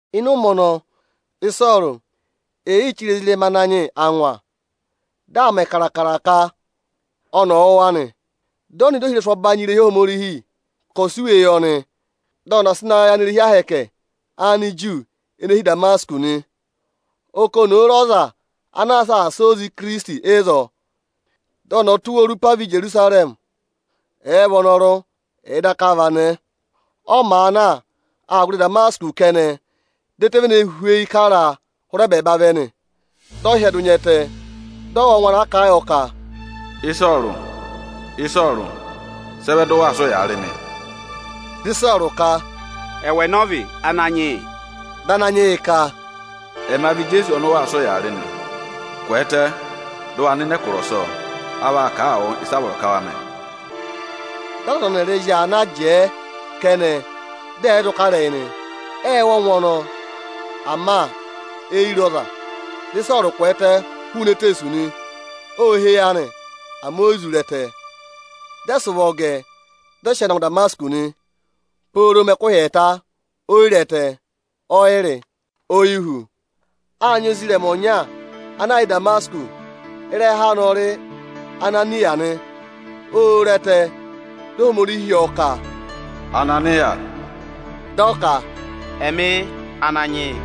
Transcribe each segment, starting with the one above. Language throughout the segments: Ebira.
Ịnị ụmẹ ọnọọ, Ịsọọrụ ee yii chire ezirẹma Ananyị yị angwa. Dị aa mẹ kaakara ka ọnị ọ̀ wụ̀ wa nị. Dị ọ nọ ịdị ohirẹsụ ọbanyị irehi Ohomorihi, ka ọ̀ sị iwe yị ọnị, dị ọnị ọ̀ sị na yị irehi ahẹkẹ Aniju nịnị ene hi Ịdamasịkọsị nị. Ọ kà oni òo re ọza ana aa saasa oze Ikirisiti ịzọọ, dị ọnị ọ tụ́ wa orupa vẹ Ijerusarẹmị, ẹ̀ẹ vị ọnọrụ, ẹ̀ẹ daka vị anẹẹ. Ọ màa na, aa gụrị Ịdamasịkọsị kẹnẹ, dị ẹtẹ vene hweyi kara a hụrẹ ẹbẹẹba vẹ nị. Dị ọ hyẹdụ nya ẹtẹ, dị ọ wụ́ ọngwẹ ana kà a yọ ka, “Ịsọọrụ, Ịsọọrụ, sị ẹ vẹ dị ụ waa sị ụyaa rị mị?” Dị Ịsọọrụ ka, “Ẹwụ ẹnẹ ọ vị, Ananyị yị?” Dị Ananyị yị ka, “Ẹma vị Ijeesu ọnị ụ waa sị ụyaa rị nị. Kwẹẹtẹ, dị ụ wa nọ ịnị ẹkụra ọsọọ; a vaa kà a wụ ịsị a vọrọ ka wa mẹ.” Dị aza ọnị ọnịrịị zị aa na, jẹẹ kẹnẹ, dị ẹ̀ yị zụ kà ịrẹyị nị. Ệ wụ́ ọngwẹ ọnọọ, ama e yi re ọza. Dị Ịsọọrụ kwẹẹtẹ hụụnị eteesu nị. Ô há eyi anị, ama o yi zụ re ẹtẹ. Dị ẹ sị ụvọ gẹ ẹ, dị ẹ sị ọọ na ngụ Ịdamasịkọsị nị. Ộ mẹ ẹkụhị ẹẹta, Ịsọọrụ o yi re ẹtẹ, ọ yị rị, o yi hú. Â nyị ozirẹma ọnya ana yà Ịdamasịkọsị. Ịrẹha anị ọ rị Ananịya nị. Ô re ẹtẹ, dị Ohomorihi hị́ ọ ka, “Ananịya!” Dị ọ ka, “Ẹmị yị, Ananyị yị.”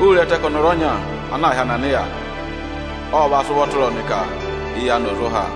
Ô re ẹtẹ ka ọnọrụ ọnya ana aā hị́ Ananịya ọ va sị ụvọ tụra ọnị ka eyi anị ọ̀ zụ há.”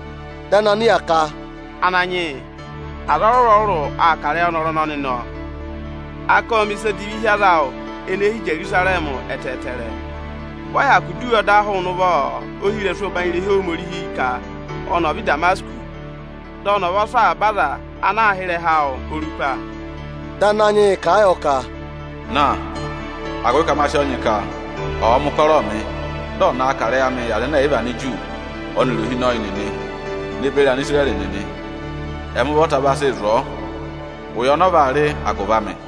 Dị Ananịya ka, “Ananyị yị, aza ọrụrụ-ọrụrụ aa kà ịrẹyị ọnọrụ ọnọnị, nọ! A ka ộ mẹ̀ ịsa odivi hi aza awụ ene hi Ijerusarẹmị ẹtẹẹtẹrẹ. Vị ọ hyakụ dọ iwe ọda hụụnị ụvọ ohirẹsụ ẹbanyị irehi Ohomorihi ka ọnị ọ̀ vẹ Ịdamasịkọsị, dị ọnị ọ̀ va sụ́ avaba aza ana àa hị́ ịrẹha awụ orupa nị.” Dị Ananyị yị kà a yọ ka, “Na! Agụvị ka ma sị ọọ nyị ka ọọ mẹ ụkọrọọ mị, dị ọ̀ na kà ịrẹyị amị yị Anigiriki ọnịrị ohinọyị nịnị ne beri Anisirẹrị nịnị. Ẹmị ụvọta vaa sịị zụ̀ ọọ ụya ọnị ọ vaa rị agụvị amị.”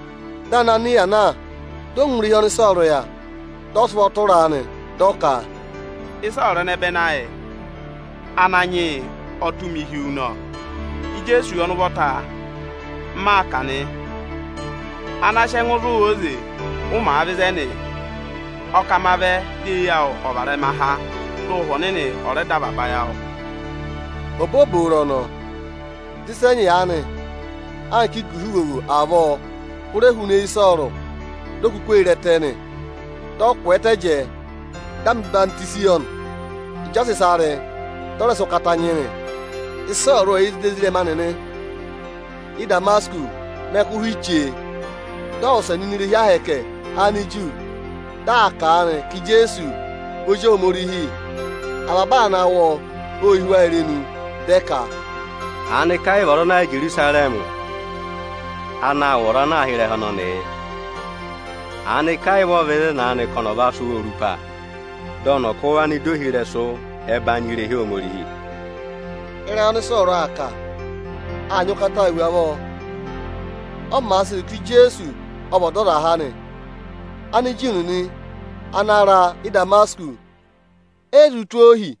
Dị Ananịya na, dị ọ ngụ irehi ọnị Ịsọọrụ yà, dị ọ sị ụvọ tụra a nị. Dị ọ ka, “Ịsọọrụ ẹnẹbẹnị ayị, Ananyị yị ọ tụ́ mị hi wu nọ. Ijeesu ọnị ụvọta m maa kà nị, ana sị ẹngụ zụ̀ wụ óze, ụ màa vẹ ịzẹnị. O ka ma vẹ, di eyi awụ ọ̀ varẹma há, dị Ụhwẹ Ọnịnị ọ̀ rẹ dọ avaba ayị awụ!” Obooboro ọnọọ, dị ịsa ẹnyị aanị anka iguha ivovo avọọ hụrẹ hụụnị eyi Ịsọọrụ, di o kuku ee re ẹtẹ nị. Dị ọ kwẹẹtẹ jẹẹ, dị a mẹ̀ ọyịhwọzenyi yọ nị. Ịjị ọ sị ịsa rị, dị ọ rẹ sị ụkata nyị nị. Ịsọọrụ ộ kà ịrẹyị Ohomorihi Ị́damasịkọsị Ịsọọrụ ộ yà ịdị ezirẹma nịnị Ị́damasịkọsị mẹ ẹkụhị chee. Dị ọ wụsẹ nọ ini irehi Ohomorihi Aniju, dị aa kà a nị ka Ijeesu vị Ozi Ohomorihi. Avaba aza ana wụ́ ọ vị ọnị o hí irenu. Dị ẹ ka, “Aanịka ẹ yị vị ọza ana yà Ijerusarẹmị ana aa wụ̀ ọza ana àa hị́ ịrẹha ọnọnị yị? Aanịka ẹ yị vị ọ vẹ ịzẹnị ka ọnị ọ̀ va sụ́ wa orupa, dị ọnị ọ̀ kụ́ wa nọ ịdị ohirẹsụ ẹbanyị irehi Ohomorihi?” Ịrẹyị ọnị Ịsọọrụ aa kà, aa nyị ụkataa hu avọọ. Ọ màa sịị zụ̀ ka Ijeesu ọ vị Ọdọzaha nị, Aniju nịnị ana ra Ị́damasịkọsị e yi zụ tụ́ ọ ohi.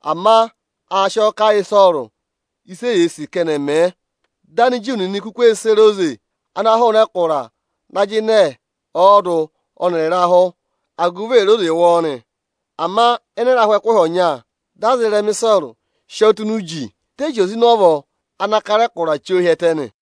Ama a sị ọọ kà yị Ịsọọrụ ịsị eyee sì ka ẹnị ẹ̀ mẹ. Dị Aniju nịnị kuku ee sere oze ana hụụnị ẹkụra na jịnẹ ọọdụ ọnịrị ịrahụ, agụvị è re oze wụ ọọ nị. Ama ịnị ịrahụ ẹkụhị ọnya, dị aza ịrẹma Ịsọọrụ sị ọọ tụ́ ini uji, dị ẹ zị oze ịnị ọvọ ana kara ẹkụra chí ọ hi ẹtẹ nị.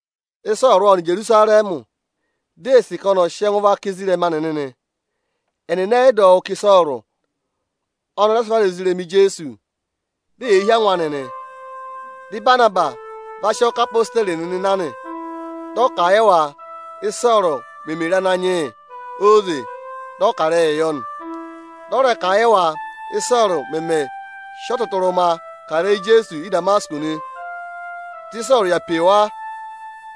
Ịsọọrụ ộ nọ Ijerusarẹmị, di ee sì ka ọnị ọ̀ sị ẹngụ vaka ezirẹma nịnị nị. Ẹnịnị ẹ yị dọ wụ́ ka Ịsọọrụ ọnị ọ rẹ sị vara ozirẹma Ijeesu, di eyee hí angwa anị nị. Dị Ịbanabasị va sị ọọ ká odeyi nịnị na nị. Dị ọ kà a yị wa, Ị́sọọrụ meme re Ananyị yị óze, dị ọ kà ịrẹyịị yọ nị. Dị ọ rẹ kà a yị wa, Ị́sọọrụ mẹmẹ sị ọtụtụrụma kà ịrẹyị Ijeesu Ị́damasịkọsị nị. Dị Ịsọọrụ yà pe wa,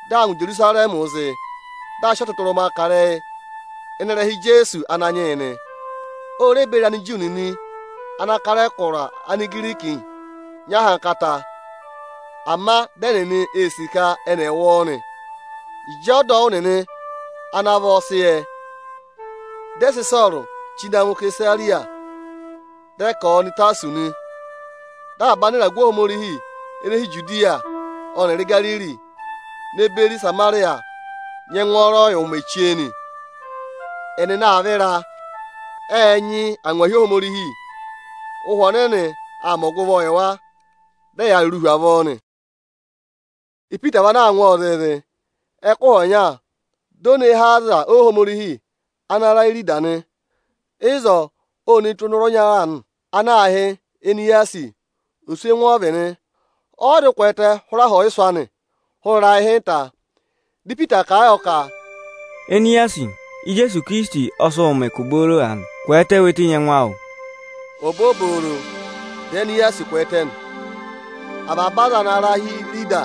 dị aa ngụ Ijerusarẹmị zị, dị aa sị ọtụtụrụma kà ịrẹyị ịnị ịrẹha Ijeesu Ananyị yị nị. O re beri Aniju nịnị ana aa kà ẹkụra Anigirikii nyị ahankata. Ama dị ẹnịnị ee sì ka ẹnị ẹ̀ wụ ọọ nị. Ịjị ọdọwụ nịnị ana vọ sị yẹ, dị ẹ sị Ịsọọrụ chí na ngụ Isesariya, dị ẹ ka ọ̀ọ nọ Ịtasọsị nị. Dị avaba anịragụ Ohomorihi ene hi Ijudiya ọnịrị Igariri ne beri Ịsamarịya nyị ẹngwọọrọ yị ụmẹ chee nị. Ẹnịnị aa vịra, ệ nyị angwahi Ohomorihi, Ụhwẹ Ọnịnị aa mẹ ọgụvọọ yị wa, dị ẹyaa rụrụụ hu avọọ nị. Ipita vị ana aa ngụ ọọ zịịzị. Ẹkụhị ọnya, di o ne hee aza Ohomorihi ana ra Írida nị. Ịzọọ, ô ne tù ọnọrụ ọnya aanị ana aā hị́ Eniyasi. Oswẹngụ ọ vị nị, ọ yị zụ kwẹẹtẹ hụrẹ aha ọyịsụ̀ anị hụrị ịrayị ịhịnta. Dị Ipita kà a yọ ka, “Eniyasi, Ijeesu Ikirisiti ọ sị wụ mẹ ụkụ booro aanị. Kwẹẹtẹ we tenyi ẹngụ awụ!” Obooboro, dị Eniyasi kwẹẹtẹ nị. Avaba aza ana ra hi Irida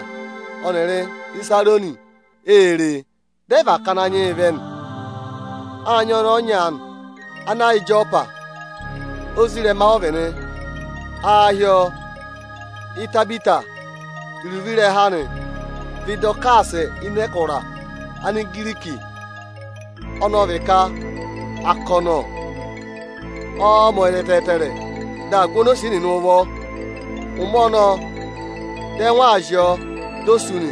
ọnịrị Ịsarọnị ê re e, dị ẹ và ká Ananyị yị vẹ nị. Â nyị ọnẹẹ ọnya aanị ana yà Ịjọpa, ozirẹma ọ vị nị. Aā hị́ ọọ Itabita. Iruvo ịrẹha anị ọ vị Ịdọkaasị ịnị ẹkụra Anigiriki, ọnọọ vị ka “akọnọ”. Ọọ̄ mẹ ọyịza ẹtẹẹtẹrẹ, dị aa gụ onosiye nịnị ụvọ. Ụmẹ ọnọọ, ẹngụ ộ zị ọọ, di o sú nị.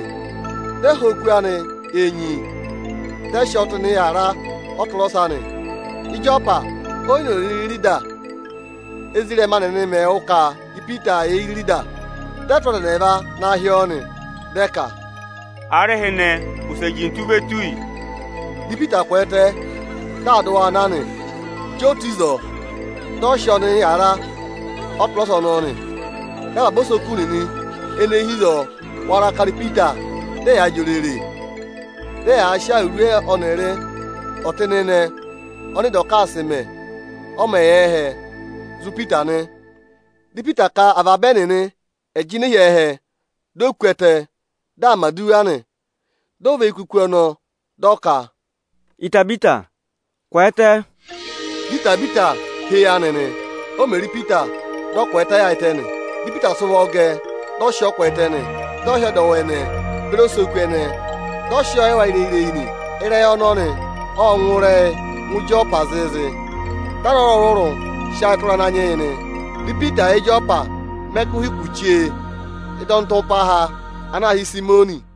Dị ẹ hụ oku anị enyi, dị ẹ sị ọọ tụ́ ịnị aku ịnị ọtụrọsa nị. Ịjọpa o yi noze rịrị Irida. Ézirẹma nịnị mẹ̀ wụ́ ka Ipita yà Irida, dị ẹ tụ́ aza ẹnị ẹẹva na hị́ ọọ nị. Dị ẹ ka, “Aarịhịnị, wụsẹ jintu ve tù yi!” Dị Ipita kwẹẹtẹ, dị aa dị waa na nị. Ịjị o tù ịzọọ, dị a sị ọọ nọ ịnị aku ịnị ọtụrọsa ọnọọ nị. Dị avaba osoku nịnị ene hi ịzọọ wara kara Ipita, dị ẹyaa jị òrèrè, dị ẹyaa sị awuru ọnịrị ọtịnịnẹ ọnị Ịdọkaasị mẹ, ọ mẹ̀ yà ẹhẹ, zụ̀ Ipita nị. Dị Ipita ka avaba ẹnịnị ẹ̀ jịnẹ hi ẹhẹ, di o ku ẹtẹ, dị aa mẹ̀ aduwa nị. Di o và eyi kà oku ọnọọ, dị ọ ka, “Itabita, kwẹẹtẹ!” Dị Itabita há eyi anị nị. O mè re Ipita, dị ọ kwẹẹtẹ yaayịtẹ nị. Dị Ipita sị ụvọ gẹ ẹ, dị ọ sị ọọ kwẹẹtẹ nị. Dị ọ hị́ ọdọwụ ẹnẹẹ beri osoku ẹnẹẹ, dị ọ sị ọọ yị wa ireyi-ireyi nị. Ịrẹyị ọnọnị ộ ngụ ịrẹyị ngụ Ịjọpa zịịzị, dị aza ọrụrụ-ọrụrụ sị ayị tụra Ananyị yị nị. Dị Ipita yà Ịjọpa mẹ ẹkụhị kù chee ị́dị ọnịtụmpaha ana aā hị́ Ịsayịmọnị nị.